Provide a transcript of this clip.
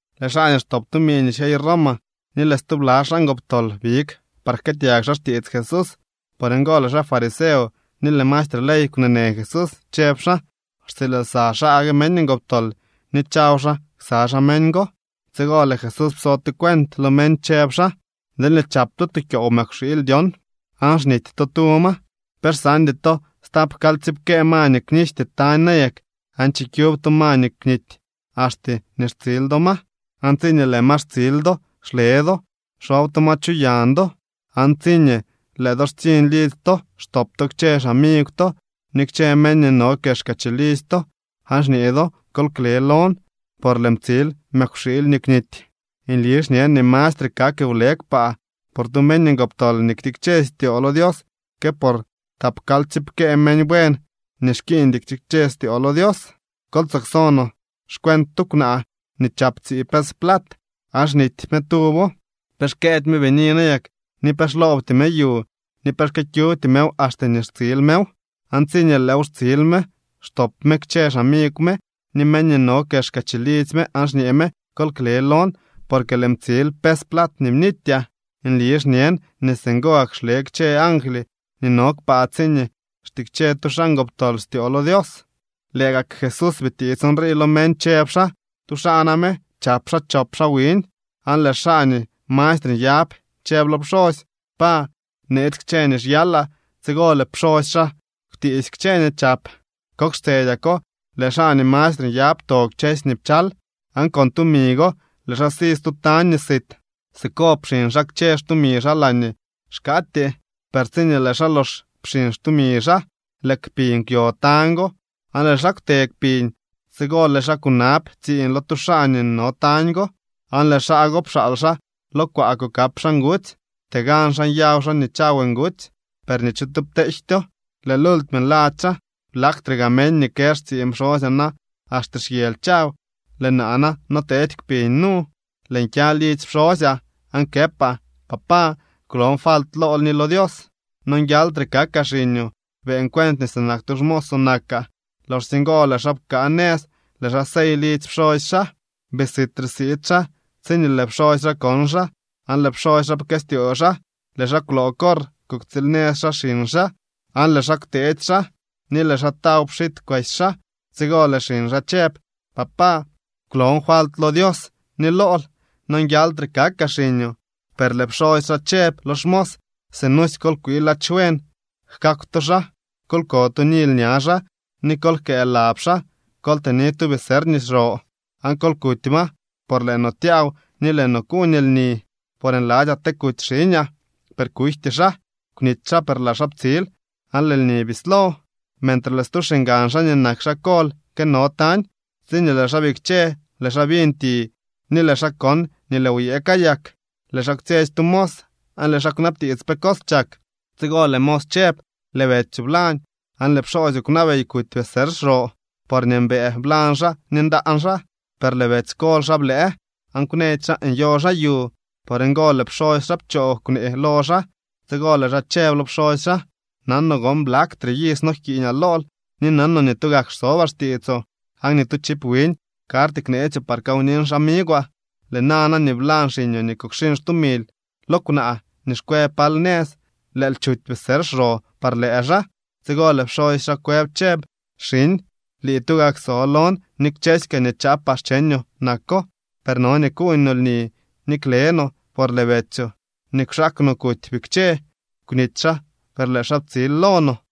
Lëë xaa nii xtop tumi nii xyey Roma ni lëë stubla xaa ngoptol big par jkëëtyag xaa xtiits Jesús. Por ngo lëë xaa fariseo ni lëë maestre ley kwneenë Jesús, chëb xaa: —Xtsiil lsa xaa gue meñ ngoptol ni chaw xaa ksa xaa meñ go. Tsigo lëë Jesús pso tu cuent lo meñ chëb xaa: —Deelñee chap to tu kyoow mëkwxiily dyon, aan xnity to tu ma, ¿pe xsaandy to stap kalyptsiipkee ma nii kwnijty tañ nayak, aan chikyub to ma nii kwnity, axte nii xtsil do ma? Aan tsiñee lëë ma xtsil do, xle do xob to ma chu yañ do, aan tsiñee lëë do xtsiñ lidzy to, xtop to kchë xamigw to ni kchë meñ nii no kexka chilidzy to, aan xñee do: “Kol kle lon, por lëën ptsil mëkwxiily nii kwnity.” Nli xñen nii mastre kak wle kpaa por tu meñ ngoptol nii ktikche styoo lo Dios que por tapkalyptsiipkee meñ buen nii xkiiñdy ktikche styoo lo Dios. ’Kol tsoo kso no xcuent tu kwnaa nii chap tsii pes plat, aan xnity me tuwo. ¿Pe xkëëdy me bini nayak ni pe xloobty me yu ni pe xkyëkyubty mew axte nii xtsil mew? Aan tsiñee lëëw xtsil me, xtop me kchë xamigw me ni meñ nii no kexka chilidzy me, aan xñee me: “Kol kle lon, porque lëën ptsil pes plat nii bnityaa.” Nli xñen nii singo gak xle kchë angly nii no kpaa tsiñee xtikche tu xaa ngoptol styoo lo Dios. Lëë gak Jesús bitiits nrii lo meñ, chëb xaa: —Tu xaa name chap xaa chop xaa wiñ, aan lëë xaa nii mastre nyab chëb lo pxosy: “Pa, neetsy kchë nii xyalaa.” Tsigo lëë pxosy xaa kwtiisy kchë nii chap. Kok xtsedyako lëë xaa nii mastre nyab pto kchësy nii pchal, aan con tumi go lëë xaa si stu tañ nii sit. Siko pxiñ xaa kchë xtumi xaa laañee xkaatyee. Per tsiñee lëë xaa lox pxiñ xtumi xaa, lëë kpiñ kwyo tañ go, aan lëë xaa kwte kpiñ. Tsigo lëë xaa kunab tsiiñ lo tu xaa nii no tañ go, aan lëë xaa go pxaal xaa lo kwaa kukap xaa ngutsy. Ptee gan xaa nyaw xaa nii chaw ngutsy, per ni tu cho pteejtyo. Lëë lultime nladzy xaa: “¡Blaktre gaa meñ nii kë xtsiiñ pxosyaa na axte xyely chaw, lëë naa na noteedy kpiñ nu! Lëën kya lidzy pxosyaa, aan këpaa: Papá, kwlon falt lool ni lo Dios. Nonguialtre kakaa xiñoo. Beeñ cuent nii sinak tu xmoosoo nakaa.” Loxsye ngo lëë xaa pkaa nëz, lëë xaa sey lidzy pxosy xaa. ’Bii sitre siid xaa tsiñee lëë pxosy xaa kon xaa, aan lëë pxosy xaa pkëstyoo xaa. Lëë xaa kwloo corr kuktsiil nëz xaa xiñ xaa, aan lëë xaa kwteetsy xaa, ni lëë xaa taw pxit kwesy xaa. Tsigo lëë xiñ xaa chëb: “Papá, kwlon falt lo Dios ni lool. Nonguialtre kakaa xiñoo.” Per lëë pxosy xaa chëb lo xmos: “Sinusy kol kwii ladx buen jkakw to xaa, kol ko tu nily ña xaa, ni kol jkëë lab xaa. Kol tëni tu becerr nii xro aan kol kuty ma, por ¡lëë no tyaaw ni lëë no kuuñ lni! Por nladzyaa te kuty xiñaa, per kujty xaa. Kwnity xaa, per lëë xaa ptsil.” Aan lëë lni bislo. ’Mentre lëë stu xiñgan xaa nii nak xaa kol këno tañ. Tsiñee lëë xaa bikche, lëë xaa biñ ti ni lëë xaa kon nii lëë wyëë kayak. Lëë xaa kwtsyetsy tu mos, aan lëë xaa kwnabtiits pe cos chak. Tsigo lëë mos chëb: “Lëë betsyoo blañ, aan lëë pxoosyoo kwnabey kuty becerr xro, porñee mbëë blañ xaa ni ndaan xaa.” Per lëë betsy kol xaa blëë, aan kwnëdy xaa nyo xaa yu. Por ngo lëë pxosy xaa pchoo kwnee lo xaa. Tsigo lëë xaa chëb lo pxosy xaa: “Nanoo gon blaktre iz nojkiiñaa lool ni nanoo nii tugak xsobaa xtiitsoo, aan ni tu chiv wiñ karty kneetsyoo par kawnin xamigwaa. Lëë nana nii blañ xiñoo nii kukxiñ xtumil lo kwnaa nii xkwe pal nëz, lëël chuty becerr xro par lëë xaa.” Tsigo lëë pxosy xaa kwëb chëb: “Xiñ, lii tugak so lon, ni kchësy kaa nii chaapaa xcheñoo nako. Per no nii kuuñ no lni ni kle no, por lëë betsyoo nii kwxaak no kuty bikche. Kwnity xaa, per lëë xaa ptsil lo no.”